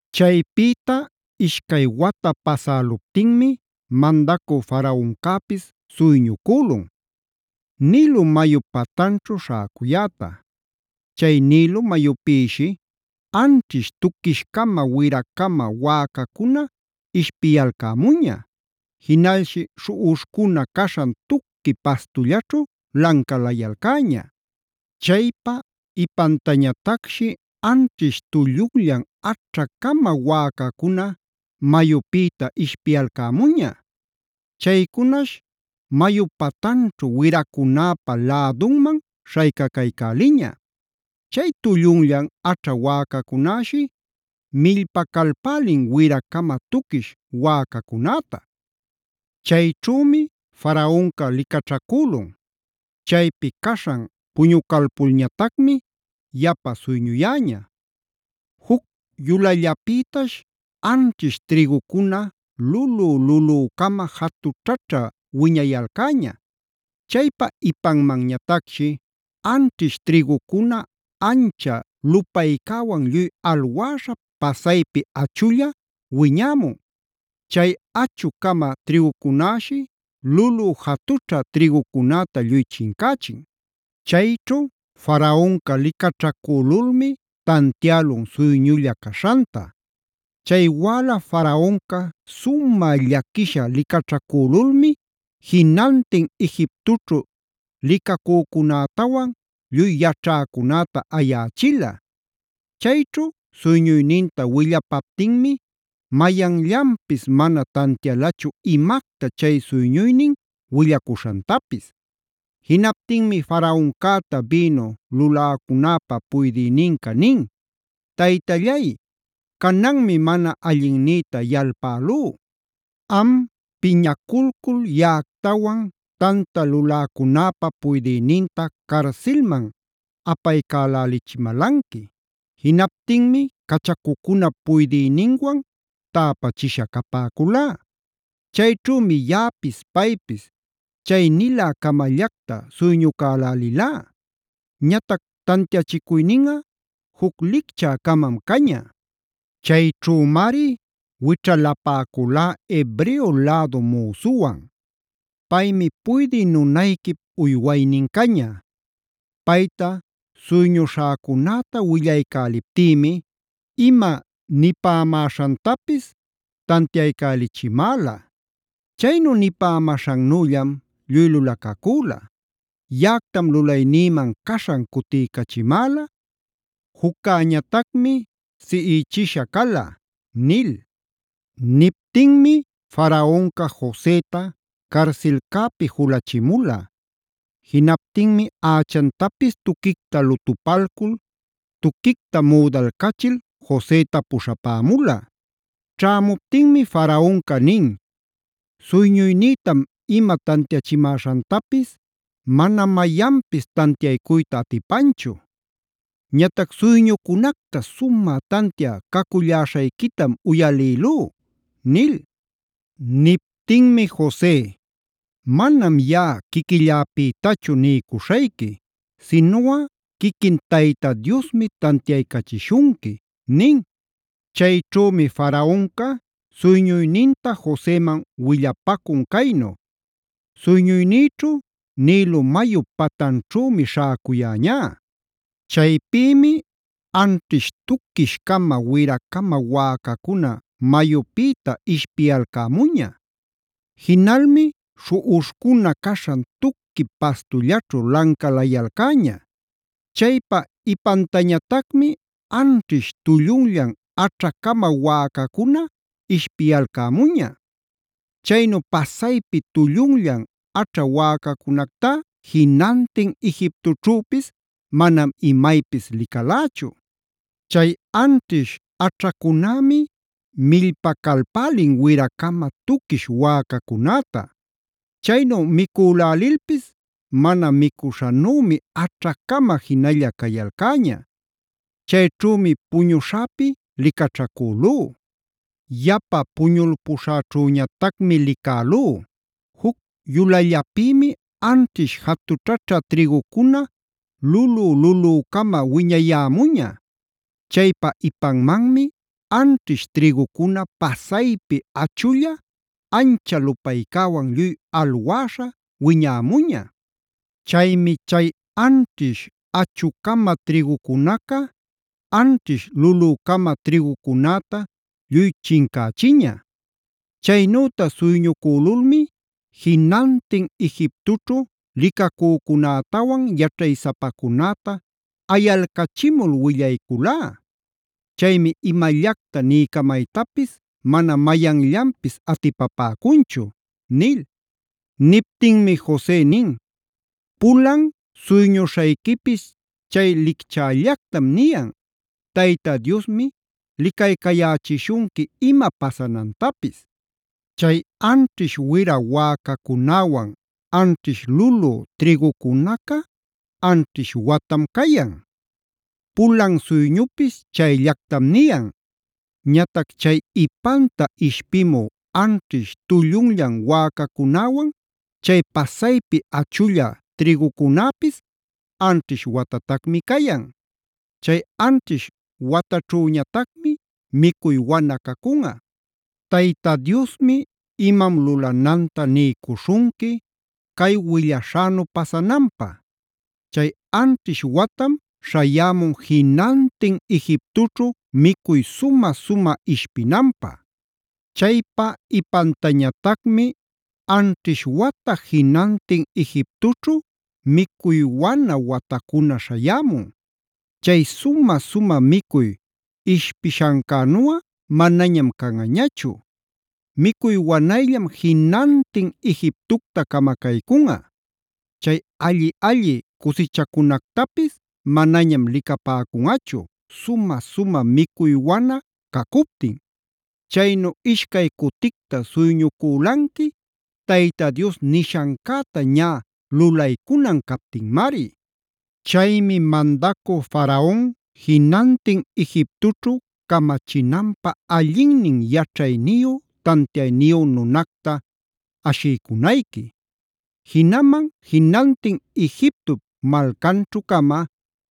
Chaypïta ishcay wata pasäluptinmi Mandacü Faraoncäpis suyñucülun: Nilo mayup patanćhu śhäcuyäta. Chay Nilo mayupïshi anćhish tuquish-cama wira-cama wäcacuna ishpiyalcämuña, jinalshi śhuꞌuśhcuna caśhan tuqui pastullaćhu lancalayalcäña. Chaypa ipantañatacshi anćhish tullunllan aćha-cama wäcacuna mayupïta ishpiyalcämuña. Chaycunash mayu patanćhu wiracunäpä lädunman śhaycacaycäliña. Chay tullunllan aćha wäcacunäshi millpacalpälin wira-cama tuquish wäcacunäta. Chayćhümi Faraonca licaćhacülun. Chaypi caśhan puñucalpulñatacmi yapa suyñuyäña: Juc yulallapïtash anćhish trïgucuna lulü-lulücama jatućhaćha wiñayalcäña. Chaypa ipanmanñatacshi anćhish trïgucuna ancha lupaycäwan lluy alwäśha pasaypi achulla wiñämun. Chay achu-cama trïgucunäshi lulü jatućha trïgucunäta lluy chincächin. Chayćhu Faraonca licaćhacülulmi tantiälun suyñulla caśhanta. Chay wäla Faraonca sumä llaquisha licaćhacülulmi jinantin Egiptoćhu licacücunätawan lluy yaćhäcunäta ayächila. Chayćhu suyñuyninta willapaptinmi mayanllanpis mana tantialachu imacta chay suyñuynin willacuśhantapis. Jinaptinmi Faraoncäta bïnu luläcunäpä puydïninca nin: “Taytallay, cananmi mana allinnïta yalpälú. Am piñaculcul yaꞌactawan, tanta luläcunäpa puydïninta carsilman apaycälälichimalanqui. Jinaptinmi cachacucunap puydïninwan täpachisha capäculá. Chayćhümi yaꞌapis paypis chay nilä-camallacta suyñucälälilá. Ñatac tantiachicuyninꞌa juc licchä-camam caña. Chayćhümari wićhalapäculá Hebreo lädu müsuwan. Paymi puydï nunayquip uywaynin caña. Payta suyñuśhäcunäta willaycäliptïmi ima nipämäśhantapis tantiaycälichimäla. Chaynu nipämäśhannüllam lluy lulacacüla. Yaꞌactam lulaynïman caśhan cutiycachimäla; juccäñatacmi siꞌichisha cala” nil. Niptinmi Faraonca Joseta carsilcäpi julachimula. Jinaptinmi ächantapis tuquicta lutupalcul, tuquicta müdalcachil Joseta puśhapämula. Ćhämuptinmi Faraonca nin: “Suyñuynïtam ima tantiachimäśhantapis mana mayanpis tantiaycuyta atipanchu. Ñatac suyñucunacta sumä tantia caculläśhayquitam uyalïlú” nil. Niptinmi Jose: “Manam yaꞌa quiquilläpïtachu niycuśhayqui, sinuꞌa quiquin Tayta Diosmi tantiaycachishunqui” nin. Chayćhümi Faraonca suyñuyninta Joseman willapacun caynu: “Suyñuynïćhu Nilo mayup patanćhümi śhäcuyäñá. Chaypïmi anćhish tuquish-cama wira-cama wäcacuna mayupïta ishpiyalcämuña. Jinalmi śhuꞌuśhcuna caśhan tuqui pastullaćhu lancalayalcäña. Chaypa ipantañatacmi anćhish tullunllan aćha-cama wäcacuna ishpiyalcämuña. Chaynu pasaypi tullunllan aćha wäcacunactá jinantin Egiptoćhüpis manam imaypis licalächu. Chay anćhish aćhacunämi millpacalpälin wira-cama tuquish wäcacunäta. Chaynu micülälilpis mana micuśhanümi aćha-cama jinalla cayalcäña. Chayćhümi puñuśhäpi licaćhacülú. “Yapa puñulpuśhäćhüñatacmi licälú: Juc yulallapïmi anćhish jatućhaćha trïgucuna lulü-lulücama wiñayämuña. Chaypa ipanmanmi anćhish trïgucuna pasaypi achulla ancha lupaycäwan lluy alwäśha wiñämuña. Chaymi chay anćhish achu-cama trïgucunaca anćhish lulü-cama trïgucunäta lluy chincächiña. Chaynüta suyñucülulmi jinantin Egiptoćhu licacücunätawan yaćhaysapacunäta ayalcachimul willayculá. Chaymi imallacta niycamaytapis mana mayanllanpis atipapäcunchu” nil. Niptinmi Jose nin: “Pulan suyñuśhayquipis chay licchällactam niyan. Tayta Diosmi licaycayächishunqui ima pasanantapis. Chay anćhish wira wäcacunäwan, anćhish lulü trïgucunaca anćhish watam cayan. Pulan suyñupis chayllactam niyan. Ñatac chay ipanta ishpimü anćhish tullunllan wäcacunäwan, chay pasaypi achulla trïgucunäpis anćhish watatacmi cayan. Chay anćhish wataćhüñatacmi micuy wana cacunꞌa. “Tayta Diosmi imam lulananta niycuśhunqui cay willaśhänu pasananpä. Chay anćhish watam śhayämun jinantin Egiptoćhu micuy sumä-sumä ishpinanpä. Chaypa ipantañatacmi anćhish wata jinantin Egiptoćhu micuy wana watacuna śhayämun. Chay sumä-sumä micuy ishpishancänuꞌa manañam canꞌañachu. Micuy wanayllam jinantin Egiptocta camacaycunꞌa. Chay alli-alli cusichacunactapis manañam licapäcunꞌachu sumä-sumä micuy wana cacuptin. Chaynu ishcay cuticta suyñucülanqui Tayta Dios nishancäta ñä lulaycunan captinmari. “Chaymi mandacü Faraon jinantin Egiptoćhu camachinanpä allinnin yaćhayniyu tantiayniyu nunacta ashiycunayqui. Jinaman jinantin Egiptop malcanćhu-cama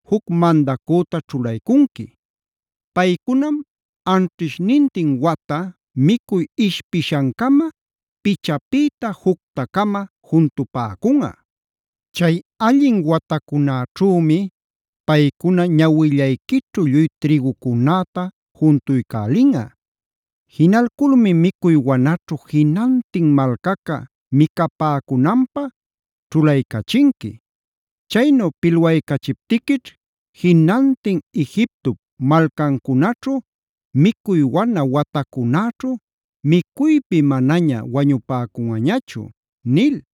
juc mandacüta ćhulaycunqui. Paycunam anćhishnintin wata micuy ishpishancama, pichapïta jucta-cama juntupäcunꞌa. Chay allin watacunäćhümi paycuna ñawillayquićhu lluy trïgucunäta juntuycälinꞌa. Jinalculmi micuy wanaćhu jinantin malcaca micapäcunanpä ćhulaycachinqui. Chaynu pilwaycachiptiquićh jinantin Egiptop malcancunaćhu micuy wana watacunäćhu micuypi manaña wañupäcunꞌañachu” nil.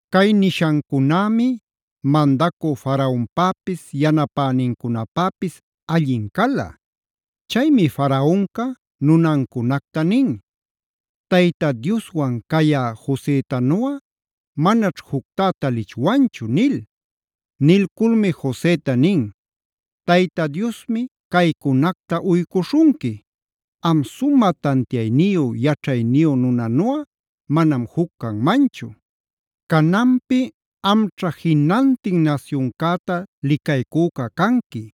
Cay nishancunämi mandacü Faraonpäpis yanapänincunapäpis allin cala. Chaymi Faraonca nunancunacta nin: “Tayta Dioswan cayá Josetanuꞌa manaćh juctá talichwanchu” nil. Nilculmi Joseta nin: “Tayta Diosmi caycunacta uycuśhunqui. Am sumä tantiayniyu, yaćhayniyu nunanuꞌa manam juc canmanchu. Cananpi amćha jinantin nasyuncäta licaycüca canqui;a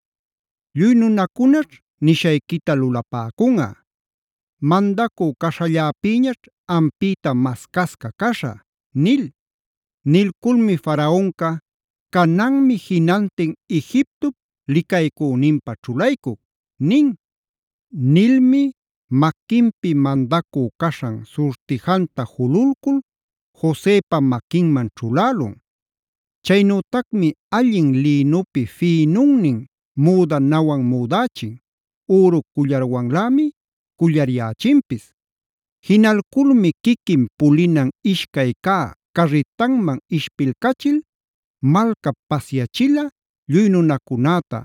lluy nunacunaćh nishayquita lulapäcunꞌa. Mandacü caśhalläpïñaćh ampïta mascasca caśhä” nil. Nilculmi Faraonca: “Cananmi jinantin Egiptop licaycüninpä ćhulaycuc” nin. Nilmi maquinpi mandacü caśhan surtijanta jululcul Josepa maquinman ćhulälun. Chaynütacmi allin lïnupi fïnunnin müdanawan müdächin, üru cullarwanlämi cullaryächinpis. Jinalculmi quiquin pulinan ishcay cä carritanman ishpilcachil malcap pasyachila, lluy nunacunäta: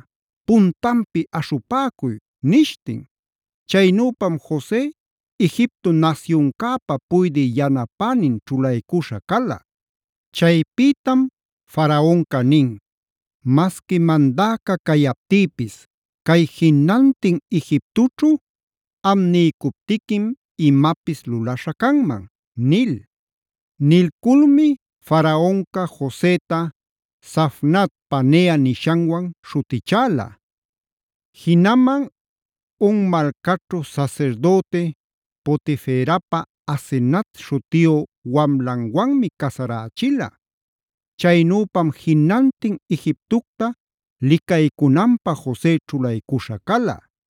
“¡Puntanpi aśhupäcuy!” nishtin. Chaynüpam Jose Egipto nasyuncäpa puydï yanapänin ćhulaycuśha cala. Chaypïtam Faraonca nin: “Masqui mandäca cayaptïpis, cay jinantin Egiptoćhu am niycuptiquim imapis lulaśhä canman” nil. Nilculmi Faraonca Joseta Zafnat-panea nishanwan śhutichäla. Jinaman On malcaćhu sasirdüti Potiferapa Asenat śhutiyu wamlanwanmi casarächila. Chaynüpam jinantin Egiptocta licaycunanpä Jose ćhulaycuśha cala.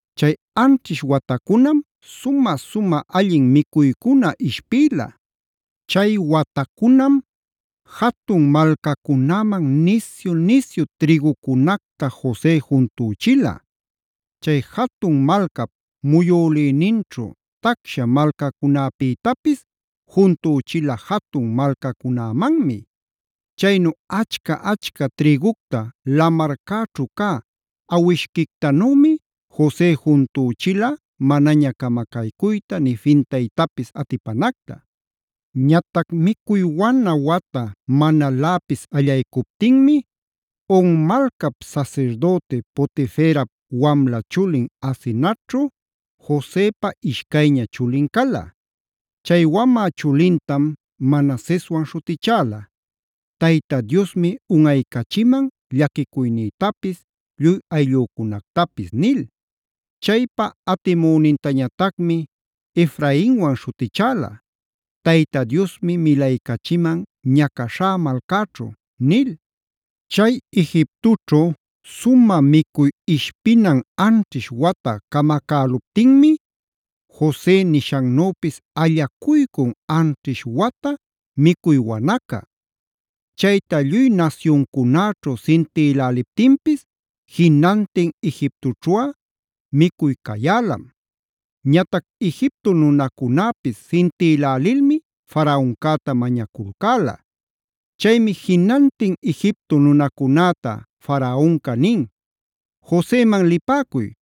Chay anćhish watacunam sumä-sumä allin micuycuna ishpïla. Chay watacunam jatun malcacunäman nisyu-nisyu trïgucunacta Jose juntüchila. Chay jatun malcap muyülïninćhu tacsha malcacunäpïtapis juntüchila jatun malcacunämanmi. Chaynu achca-achca trïgucta lamarcäćhu cä awishquictanümi Jose juntüchila manaña camacaycuyta, nï fintaytapis atipanacta. Ñatac micuy wana wata manaläpis allaycuptinmi On malcap sasirdüti Potiferap wamla chulin Asenatćhu Josepa ishcayña chulin cala. Chay wamä chulintam Manaseswan śhutichäla: “Tayta Diosmi unꞌaycachiman llaquicuynïtapis, lluy ayllücunactapis” nil. Chaypa atimünintañatacmi Efrainwan śhutichäla: “Tayta Diosmi milaycachiman ñacaśhá malcäćhu” nil. Chay Egiptoćhu sumä micuy ishpinan anćhish wata camacäluptinmi, Jose nishannüpis allacuycun anćhish wata micuy wanaca.b Chayta lluy nasyuncunäćhu sintiläliptinpis jinantin Egiptoćhuꞌa micuy cayälam. Ñatac Egipto nunacunäpis sintïlälilmi Faraoncäta mañaculcäla. Chaymi jinantin Egipto nunacunäta Faraonca nin: “Joseman lipäcuy,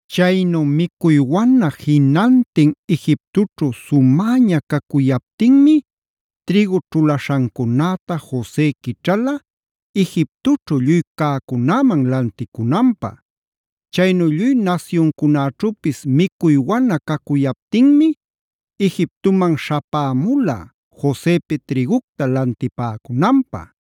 Chaynu micuy wana jinantin Egiptoćhu sumäña cacuyaptinmi trïgu ćhulaśhancunäta Jose quićhala, Egiptoćhu lluy cäcunäman lanticunanpä. Chaynu lluy nasyuncunaćhüpis micuy wana cacuyaptinmi Egiptoman śhapämula Josepi trïgucta lantipäcunanpä.